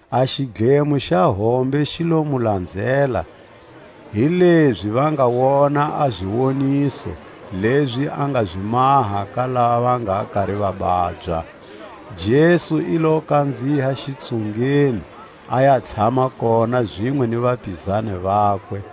A xidlemo xa hombe xi lo mu lanzela, hilezi va nga wona a ziwoniso lezi a nga zi maha ka lava va nga kari va babya: Jesu i lo kanziha xitsungeni, a ya tshama kona zinwe ni vapizani vakwe.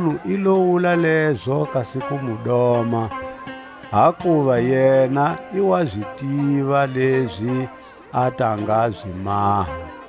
Makunu i lo wula lezo kasi ku mu doma; hakuva yena i wa zi tiva lezi a ta nga zi maha.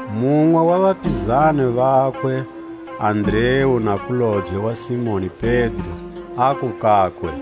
Munwe wa vapizani vakwe, Andreu nakulobye wa Simoni Pedro, aku kakwe: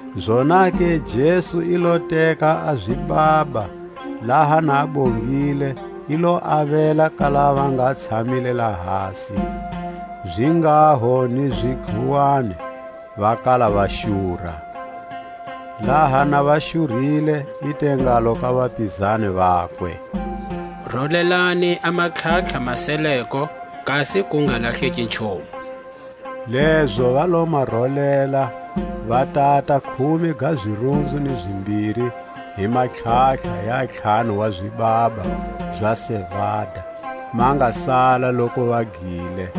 Zonake Jesu i lo teka a zibaba, laha na a bongile, i lo avela ka lava va nga tshamile lahasi, zinghaho ni zidluwani, va kala va xura. Laha na va xurile, i te ngalo ka vapizani vakwe: Rolelani a matlhatlha ma seleko, kasi ku nga lahleki nchumu. Lezo va lo ma rolela, va tata khume ga zirunzu ni zimbiri hi matlhatlha ya ntlhanu wa zibaba za sevada, ma nga sala loku va gile.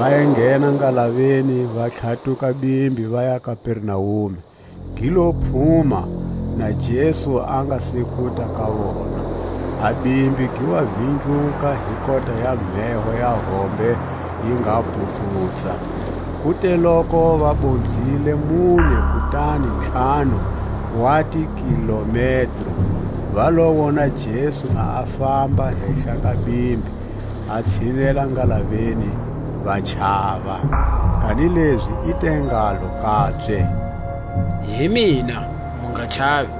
va enghena ngalaveni, va tlhatuka bimbi vaya Kapernaume. Gi lo phuma, na Jesu a nga se kuta ka vona. A bimbi gi wa vindluka hi kota ya mheho ya hombe yi nga bhubhutsa. Ku te loku va bonzile mune kutani ntlhanu wa tikilometro, va lo wo na Jesu na a famba hehla ka bimbi, a tshinela ngalaveni; va chava. Kanilezi i te ngalo kabye: Hi mina, mu nga chavi.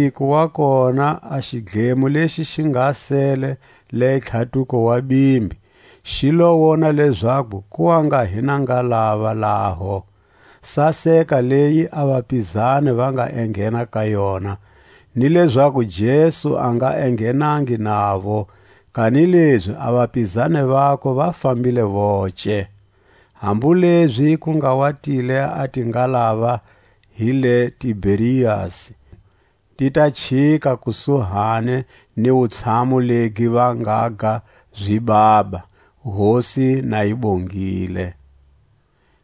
Hi manziko wa kona a xidlemo lexi xi nga sele le tlhatuko wa bimbi, xi lo wona lezaku ku wa nga hi na ngalava laho, saseka leyi a vapizani va nga enghena ka yona, ni lezaku Jesu a nga enghenangi navo, kanilezi a vapizani vakwe va fambile voce. Hambu lezi ku nga wa tile a tingalava hi le Tiberiasi, ti ta chika kusuhani ni wutshamu legi va ngaga zibaba, Hosi na yi bongile.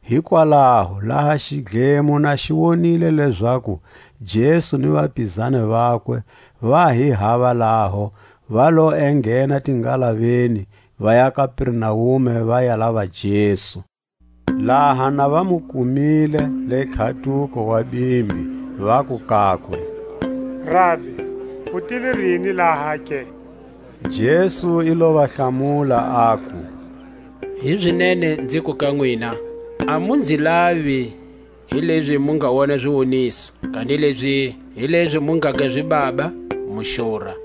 Hikwalaho laha xidlemo na xi wonile lezaku Jesu ni vapizani vakwe va hi hava laho, va lo enghena tingalaveni, vaya Kapernaume va ya lava Jesu. Laha na va mu kumile le tlhatuko wa bimbi, vaku kakwe: Rabi, u tile rini laha ke? Jesu i lo va hlamula, aku: Hizinene nziku ka nwina: A mu nzi lavi hilezi mu nga wona ziwoniso, kanilezi hilezi mu ngaga zibaba, mu xura.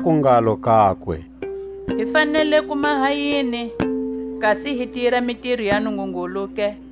Vaku ngalo kakwe: Hi fanele ku maha yini, kasi hi tira mitiro ya Nungungulu ke?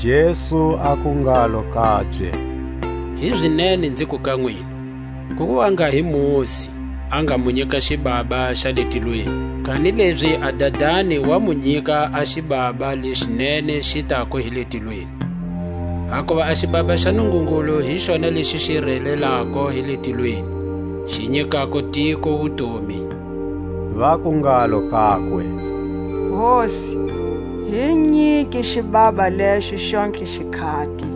Jesu aku ngalo kabye: Hizinene nziku ka nwina: Ku wa nga hi Mosi a nga mu nyika xibaba xa le tilweni; kanilezi a Dadani wa mu nyika a xibaba leʼxi nene xi tako hi le tilweni. Hakuva a xibaba xa Nungungulu hi xona lexi xi relelako hi le tilweni, xi nyikako tiko wutomi. Vaku ngalo kakwe: Hosi, hi nyike xibaba lexo xontlhe xikhati.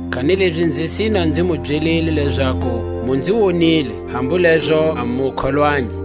Kanilezi, nzi sina nzi mu byelile lezaku, Mu nzi wonile, hambu lezo a mu kholwangi.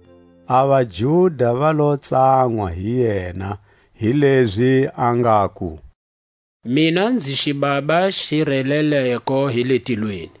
A vaJuda va lo tsanwa hi yena, hilezi a ngaku: Mina nzi xibaba xi releleko hi le tilweni.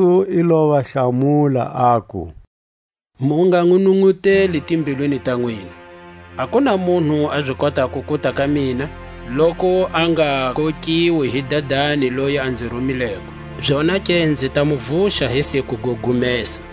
Jesu i lo va hlamula, aku: Mu nga nʼununʼuteli timbilwini ta nwina. A ku na munhu a zi kotako kuta ka mina, loku a nga kokiwi hi Dadani loyi a nzi rumileko; zonake nzi ta mu vuxa hi siku go gumesa.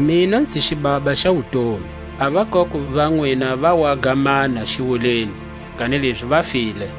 Mina nzi xibaba xa wutomi. A vakoko va nwina va waga manna xiwuleni, kanilezi va file;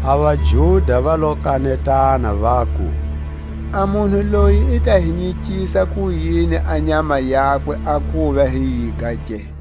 A vaJuda va lo kanetana vaku: A munhu loyi i ta hi nyikisa kuyini a nyama yakwe a kuva hi yiga ke?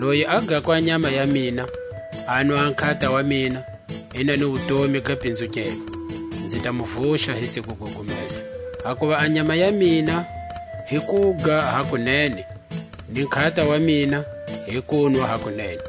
Loyi a gako a nyama ya mina, anwa a nkhata wa mina, i na ni wutomi ga pinzukelwa; nzi ta mu vuxa hi siku go gumesa. Hakuva a nyama ya mina hi kuga hakunene, ni nkhata wa mina hi kunwa hakunene.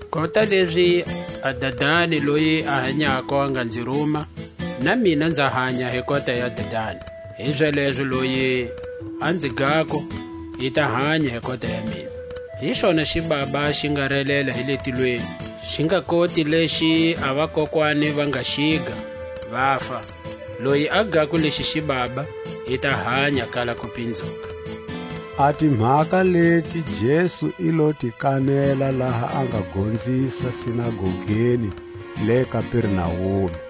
Kota lezi a Dadani loyi a hanyako a nga nzi ruma, na mina nza hanya hi kota ya Dadani; hizalezo loyi a nzi gako, i ta hanya hi kota ya mina. Hi xona xibaba xi nga relela hi le tilweni; xi nga koti lexi a vakokwani va nga xiga, vafa; loyi a gako lexi xibaba, i ta hanya kala kupinzuka. A timhaka leti Jesu i lo ti kanela laha a nga gonzisa sinagogeni le Kapernaume.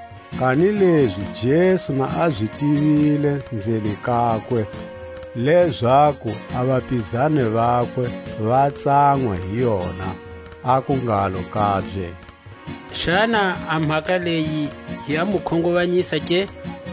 Kanilezi Jesu na a zi tivile nzeni kakwe, lezaku a vapizani vakwe va tsanwa hi yona, aku ngalo kabye: Xana a mhaka leyi ya mu khunguvanyisa ke?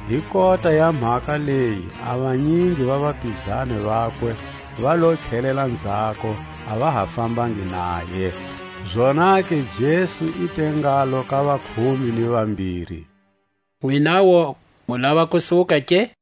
Hi kota ya mhaka leyi a vanyingi va vapizani vakwe va lo tlhelela nzhako, a va ha fambangi naye. A wukustumunyu ga Pedro. Zonake Jesu i te ngalo ka vakhume ni vambiri: Nwinawu mu lava ku suka ke?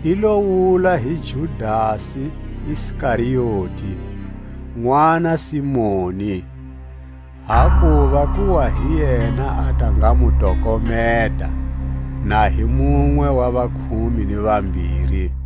I lo wula hi Judasi Iskarioti, nʼwana Simoni, hakuva ku wa hi yena a ta nga mu tokometa, na a hi munwe wa vakhume ni vambiri.